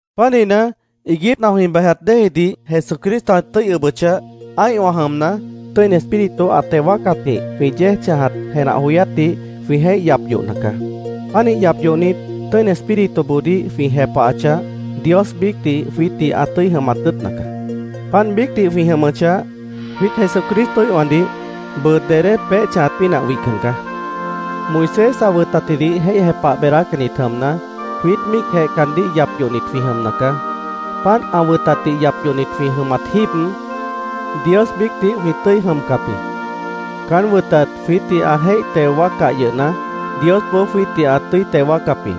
Pánihna, iiguípna jwĩ bejat déejidih Jesucristo ã tʉ́i ʉbʉchah, ã́ihwã jʉmna, Tʉ́ini Espíritu ã teo wáacatjĩh jwĩ yéej chãjat jenah joyátdih jwĩ jéih yap yohna caá. Pánih yap yohnit, Tʉ́ini Espírituboodíh jwĩ jepahachah, Dios biícdih jwiítdih ã tʉ́i jʉmat tʉ́ʉtna caá. Páant biícdih jwĩ jʉmʉchah, jwiít Jesucristoíhwãdih bʉʉ dedé peéh chãjat pínah wihcan caá. Moisés ã wʉtatjidih jéih jepah beedácannit jʉmna, jwiít míicjeh caandíh yap yohnit jwĩ jʉmna caá. Páant ã wʉtatdih yap yohnit jwĩ jʉmat jíib, Dios biícdih jwĩ tʉ́i jʉmcap jĩ. Caán wʉtat jwiítdih ã jéih teo wáaccah yʉhna, Diosboó jwiítdih ã tʉ́i teo wáacap jĩ.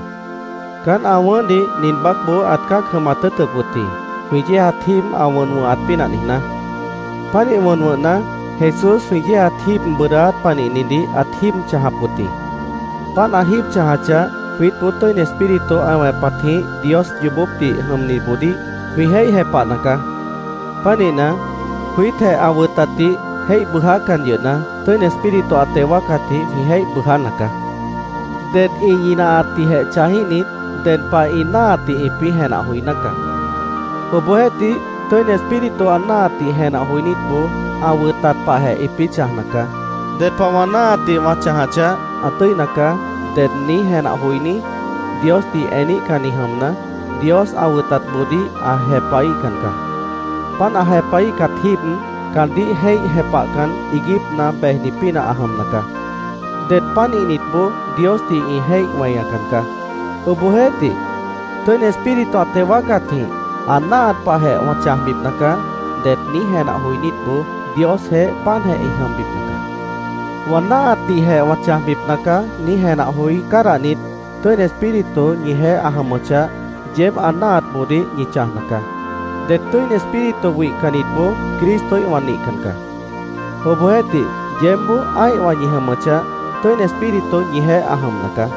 Caán ã wʉ̃ʉ́hdih nin baácboó ãt cã́ac jʉmat tʉ́ʉtʉp wʉt jĩ, jwĩ yéejat jíib ã wʉn wʉ̃hat pínah niijná. Pánih wʉn wʉ̃hna, Jesús jwĩ yéejat jíib bʉʉdáát panihnidih ãt jíib chãjap wʉt jĩ. Páant ã jíib chãjachah, jwiítboó Tʉ́ini Espíritu ã wẽpatjĩh Dios yoobópdih jʉmniboodíh jwĩ jéih jepahna caá. Pánihna, jwiítjeh ã wʉtatdih jéih bʉʉjácan yʉhna, Tʉ́ini Espíritu ã teo wáacatjĩh jwĩ jéih bʉʉjána caá. Det ĩ ñinahatdihjeh chãjíhnit, ded pah ĩ náahatdih ĩpĩ́ jenah joiná caá. Obohjeéhtih, Tʉ́ini Espíritu ã náahatdih jenah joinítboó ã wʉtat pahjeh ĩpĩ́ chãjna caá. “Ded pah wã náahatdih wã chãjachah, ã tʉ́ina caá”, ded niíj jenah joiní Diosdih eníhcanni jʉmna, Dios ã wʉtatboodíh ã jepahíhcan caá. Páant ã jepahíhcat jíib, caandíh jéih jepahcan, iiguípna bejni pínah ã jʉmna caá. Det pánihnitboó Diosdih ĩ jéih weñacan caá. Obohjeéhtih, “Tʉ́ini Espíritu ã teo wáacatjĩh ã náahat pahjeh wã chãjbipna caá”, det niíj jenah joinítboó Diosjeéh páantjeh ĩ jʉmbipna caá. “Wã náahatdihjeh wã chãjbipna caá”, niíj jenah joí cádahnit, Tʉ́ini Espíritu ñijeéh ã jʉmʉchah, yeéb ã náahatboodíh ñi chãjna caá. Det Tʉ́ini Espíritu wihcannitboó Cristoíhwã nihcan caá. Obohjeéhtih, yeébboó ã́ihwã ñi jʉmʉchah, Tʉ́ini Espíritu ñijeéh ã jʉmna caá.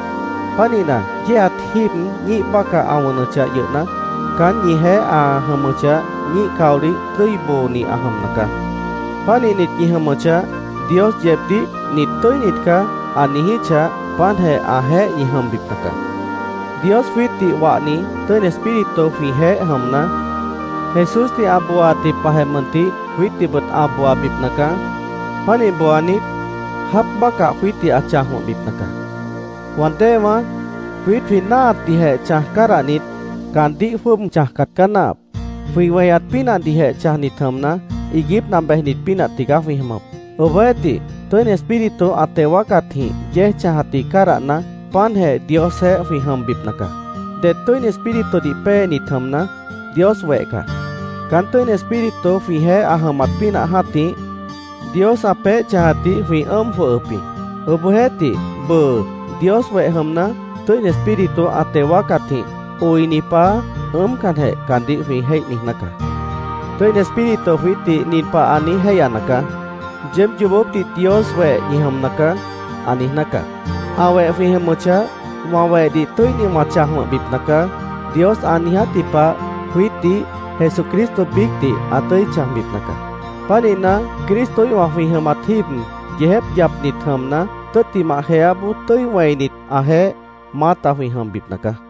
Pánihna, yéejat jíib ñíih bácah ã wʉnʉchah yʉhna, caán ñijeéh ã jʉmʉchah, ñíih caolih tʉ́i booni ã jʉmna caá. Pánihnit ñi jʉmʉchah, Dios yeebdíh “Nit tʉ́init caá”, ã niijíchah, páantjeh ãjeéh ñi jʉmbipna caá. Dios jwiítdih wahni Tʉ́ini Espíritu jwĩjeéh jʉmna, Jesúsdih ã booaatji pahjeh mʉntih jwiítdihbʉt ã booabipna caá. Pánih booanit, jáap bácah jwiítdih ã chãj wʉ̃hbipna caá. Wã déewãá, jwiít jwĩ náahatdihjeh chãj cádahnit, caandíh jwʉ́ʉb chãjcat caá náahap. Jwĩ weñat pínahdihjeh chãjnit jʉmna, iiguípna bejnit pínah tigaá jwĩ jʉmʉp. Obohjeéhtih, Tʉ́ini Espíritu ã teo wáacatjĩh yéej chãjatdih cádahna, páantjeh Diosjeéh jwĩ jʉmbipna caá. Det Tʉ́ini Espíritudih péenit jʉmna, Dios weh caá. Caán Tʉ́ini Espíritu jwĩjeéh ã jʉmat pínah jã́tih, Dios ã peéh chãjatdih jwĩ ʉ́ʉm jwʉhʉp jĩ. Obohjeéhtih, bʉʉ Dios weh jʉmna, Tʉ́ini Espíritu ã teo wáacatjĩh “Oini Paá”, ʉ́ʉmcanjeh caandíh jwĩ jéih niijná caá. Tʉ́ini Espíritu jwiítdih nin pah ã niíj jéihyana caá: “Yeéb yoobópdih Dios weh ñi jʉmna caá”, ã niijná caá. Ã weh jwĩ jʉmʉchah, “Wã wehdih tʉ́inidih wã chãj wʉ̃hbipna caá”, Dios ã niijátji pah, jwiítdih, Jesucristo biícdih, ã tʉ́i chãjbipna caá. Pánihna, Cristoíhwã jwĩ jʉmat jíib yeejép yapnit jʉmna, tʉ́ttimah jeáboó tʉ́i wẽinit, ãjeéh maáta jwĩ jʉmbipna caá.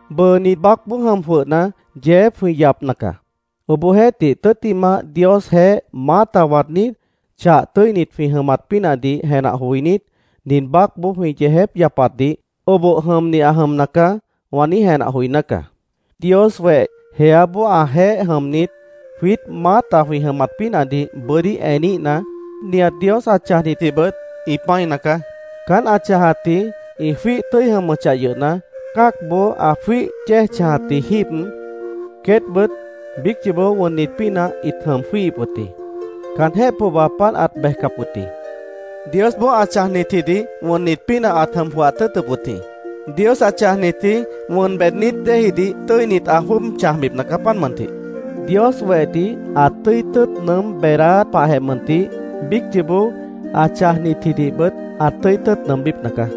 Bʉʉ nin baácboó jʉm jwʉhna, yeejép jwĩ yapna caá. Obohjeéhtih, tʉ́ttimah Diosjeéh maáta waadnít, chah tʉ́init jwĩ jʉmat pínahdih jenah joinít, nin baácboó jwĩ yeejép yapatdih “Oboh jʉmni ã jʉmna caá”, wã niíj jenah joiná caá. Dios weh jeáboó ãjeéh jʉmnit, jwiít maáta jwĩ jʉmat pínahdih bʉ́dí eníhna, nihat Dios ã chãjnitjibʉt ĩ pã́ina caá. Caán ã chãjnitji ĩ jwíih tʉ́i jʉmʉchah yʉhna, cã́acboó ã jwíih yéej chãjatji jíib, queétbʉt biíc yoobó wʉnnit pínah ĩt jʉm jwíihip wʉt jĩ. Caanjéh pohba páant ãt bejcap wʉt jĩ. Diosboó ã chãjnitjidih wʉnnit pínah ãt jʉm jwʉhat tʉ́ʉtʉp wʉt jĩ. Dios ã chãjnitji wʉn beednít déejidih tʉ́init ã jwʉ́ʉb chãjbipna caá, páant mʉntih. Dios wehdih ã tʉ́i tʉ́ʉt nʉʉ́m beedáát pahjeh mʉntih, biíc yoobó ã chãjnitjidihbʉt ã tʉ́i tʉ́ʉt nʉʉmbípna caá.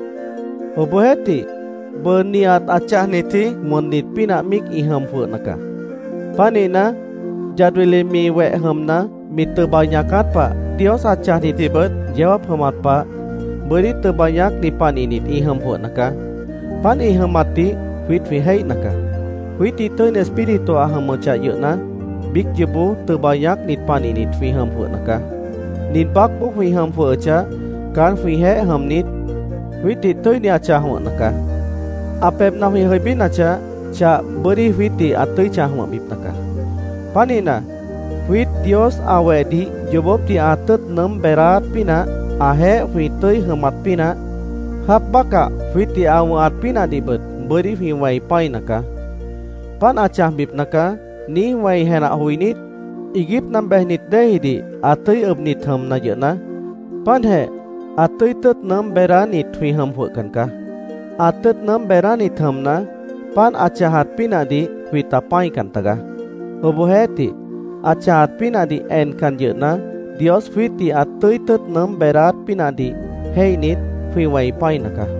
Obohjeéhtih, bʉʉ nihat ã chãjnitji wʉnnit pínah míic ĩ jʉm jwʉhna caá. Pánihna, yad wili mi weh jʉmna, mi tʉba ñaacát pah Dios ã chãjnitjibʉt yeó jáap jʉmat pah bʉ́dí tʉba ñaácni panihnit ĩ jʉm jwʉhna caá. Páant ĩ jʉmatdih jwiít jwĩ jéihna caá. Jwiítdih Tʉ́ini Espíritu ã jʉmʉchah yʉhna, biíc yoobó tʉba ñaácnit panihnit jwĩ jʉm jwʉhna caá. Nin baácboó jwĩ jʉm jwʉhʉchah, caán jwĩjeéh jʉmnit, jwiítdih tʉ́ini ã chãj wʉ̃hna caá. Ã pebhna jwĩ jʉibínachah, chah bʉ́dí jwiítdih ã tʉ́i chãj wʉ̃hbipna caá. Pánihna, jwiít Dios ã wehdih yoobópdih ã tʉ́ʉt nʉʉ́m beedáát pínah, ãjeéh jwĩ tʉ́i jʉmat pínah, jáap bácah jwiítdih ã wʉ̃hat pínahdihbʉt bʉ́dí jwĩ wẽi pã́ina caá. “Páant ã chãjbipna caá”, niíj wẽi jenah joinít, iiguípna bejnit déejidih ã tʉ́i ʉbnit jʉmna yʉhna, páantjeh ã tʉ́i tʉ́ʉt nʉʉ́m beedánit jwĩ jʉm jwʉhcan caá. Ã tʉ́ʉt nʉʉ́m beednít jʉmna, páant ã chãjat pínahdih jwĩta pã́ican tagaá. Obohjeéhtih, ã chãjat pínahdih encan yʉhna, Dios jwiítdih ã tʉ́i tʉ́ʉt nʉʉ́m beedáát pínahdih jéihnit, jwĩ wẽi pã́ina caá.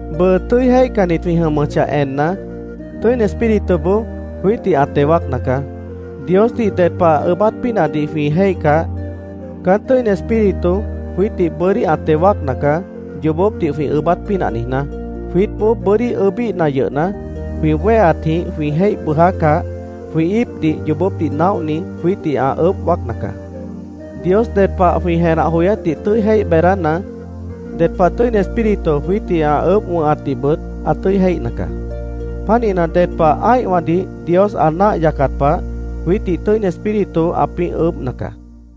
Bʉʉ tʉ́i jéihcannit jwĩ jʉmʉchah enna, Tʉ́ini Espírituboó jwiítdih ã teo wáacna caá. Diosdih ded pah ʉʉ́bát pínahdih jwĩ jéihcah, caán Tʉ́ini Espíritu jwiítdih bʉ́dí ã teo wáacna caá, yoobópdih jwĩ ʉʉ́bát pínah niijná. Jwiítboó bʉ́dí ʉʉ́bíhna yʉhna, jwĩ wéheatjĩh jwĩ jéih bʉʉjácah, jwĩ íipdih yoobópdih naóhni jwiítdih ã ʉʉ́bh wáacna caá. Dios ded pah jwĩ jenah joyátdih tʉ́i jéih beedána, ded pah Tʉ́ini Espíritu jwiítdih ã ʉʉ́bh wʉ̃hatdihbʉt ã tʉ́i jéihna caá. Pánihna, ded pah ã́ihwãdih Dios ã náah yacat pah, jwiítdih Tʉ́ini Espíritu ãpĩ́ ʉʉ́bhna caá.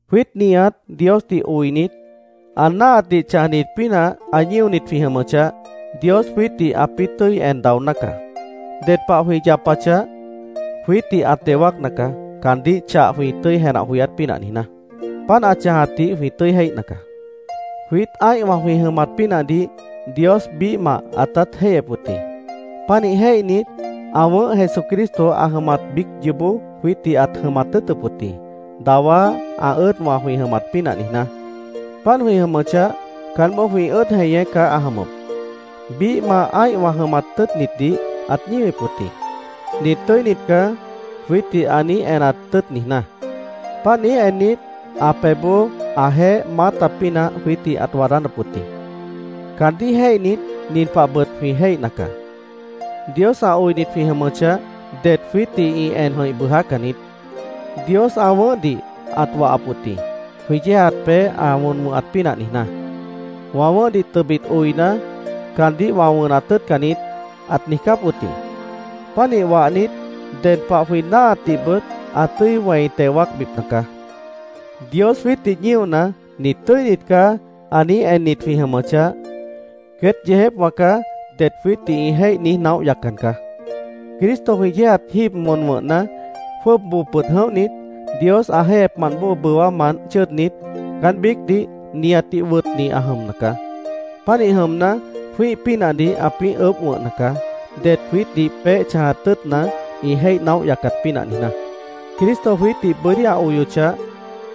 Jwiít nihat Diosdih oinit, ã náahatdih chãjnit pínah ã ñíonit jwĩ jʉmʉchah, Dios jwiítdih ãpĩ́ tʉ́i en daoná caá. Ded pah jwĩ yapachah, jwiítdih ã teo wáacna caá, caandíh chah jwĩ tʉ́i jenah joyát pínah niijná. Páant ã chãjatdih jwĩ tʉ́i jéihna caá. Jwiít ã́ihwã jwĩ jʉmat pínahdih Dios biíhmah ãtát jéihyep wʉt jĩ. Pánih jéihnit, ã wʉ̃ʉ́h Jesucristo ã jʉmat biíc yoobó jwiítdih ãt jʉmat tʉ́ʉtʉp wʉt jĩ, dawá ã ʉ́ʉdwã jwĩ jʉmat pínah niijná. Páant jwĩ jʉmʉchah, caánboó jwĩ ʉ́ʉd jeñé caá ã jʉmʉp. Biíhmah ã́ihwã jʉmat tʉ́ʉtnitdih ãt ñíwip wʉt jĩ, “Nit tʉ́init caá”, jwiítdih ã niíj enat tʉ́ʉt niijná. Páant niíj ennit, ã pebhboó ãjeéh maáta pínah jwiítdih ãt waadánap wʉt jĩ. Caandíh jéihnit, nin pahbʉt jwĩ jéihna caá: Dios ã oinit jwĩ jʉmʉchah, det jwiítdih ĩ en jʉ̃ih bʉʉjácan niít. Dios ã wʉ̃ʉ́hdih ãt wahap wʉt jĩ, jwĩ yéejat peéh ã wʉn wʉ̃hat pínah niijná. “Wã wʉ̃ʉ́hdih tʉbit oina, caandíh wã wʉnat tʉ́ʉtcan niít”, ãt niijcáp wʉt jĩ. Pánih wahnit, ded pah jwĩ náahatdihbʉt ã tʉ́i wẽi teo wáacbipna caá. Dios jwiítdih ñíona, “Nit tʉ́init caá”, ã niíj ennit jwĩ jʉmʉchah, “Queét yeejépwã caá”, det jwiítdih ĩ jéih niíj naóh yaccan caá. Cristo jwĩ yéejat jíib wʉn wʉ̃hna, jwʉ́ʉb boo pʉd jʉ̃óhnit, Dios ã jéihyepmant bóo bʉwámant chʉ́ʉdnit, caán biícdih nihatdih wʉtni ã jʉmna caá. Pánih jʉmna, jwĩ́ih pínahdih ãpĩ́ ʉʉ́bh wʉ̃hna caá, det jwiítdih peéh chãjat tʉ́ʉtna, ĩ jéih naóh yaccat pínah niijná. Cristo jwiítdih bʉ́dí ã oyochah,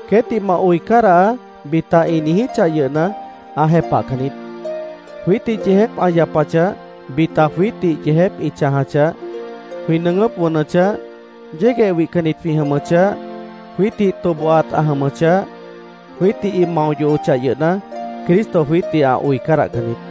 “Queétdih ma oi cádahaá”, bita ĩ niijíchah yʉhna, ã jepahcan niít. Jwiítdih yeejép ã yapachah, bita jwiítdih yeejép ĩ chãjachah, jwĩ nʉʉgʉ́p wʉnʉchah, yégueh wihcannit jwĩ jʉmʉchah, jwiítdih tobohat ã jʉmʉchah, jwiítdih ĩ mao yohochah yʉhna, Cristo jwiítdih ã oi cádahcan niít.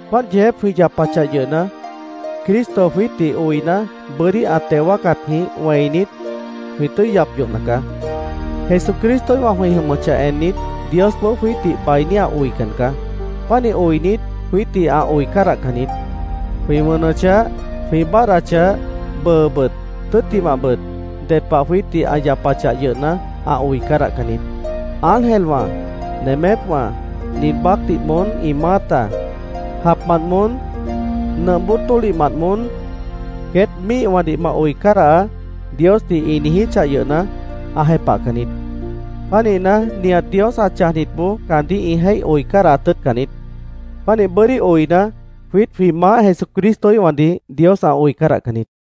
Páant yeejép jwĩ yapachah yʉhna, Cristo jwiítdih oina, bʉ́dí ã teo wáacatjĩh wẽinit, jwĩ tʉ́i yap yohna caá. Jesucristoíhwã jwĩ jʉmʉchah ennit, Diosboó jwiítdih bainí ã oican caá. Pánih oinit, jwiítdih ã oi cádahcan niít. Jwĩ wʉnʉchah, jwĩ báadhdachah, bʉʉbʉt, tʉ́ttimahbʉt, ded pah jwiítdih ã yapachah yʉhna, ã oi cádahcan niít. Ángelwã, nemépwã, nin baácdih moón ĩ maáta, japmant moón, nʉmp bóo tólihmant moón, “Queét míihwãdih ma oi cádahaá”, Diosdih ĩ niijíchah yʉhna, ã jepahcan niít. Pánihna, nihat Dios ã chãjnitboó caandíh ĩ jéih oi cádahat tʉ́ʉtcan niít. Pánih bʉ́dí oina, jwiít jwĩ Maáh Jesucristoíhwãdih Dios ã oi cádahcan niít.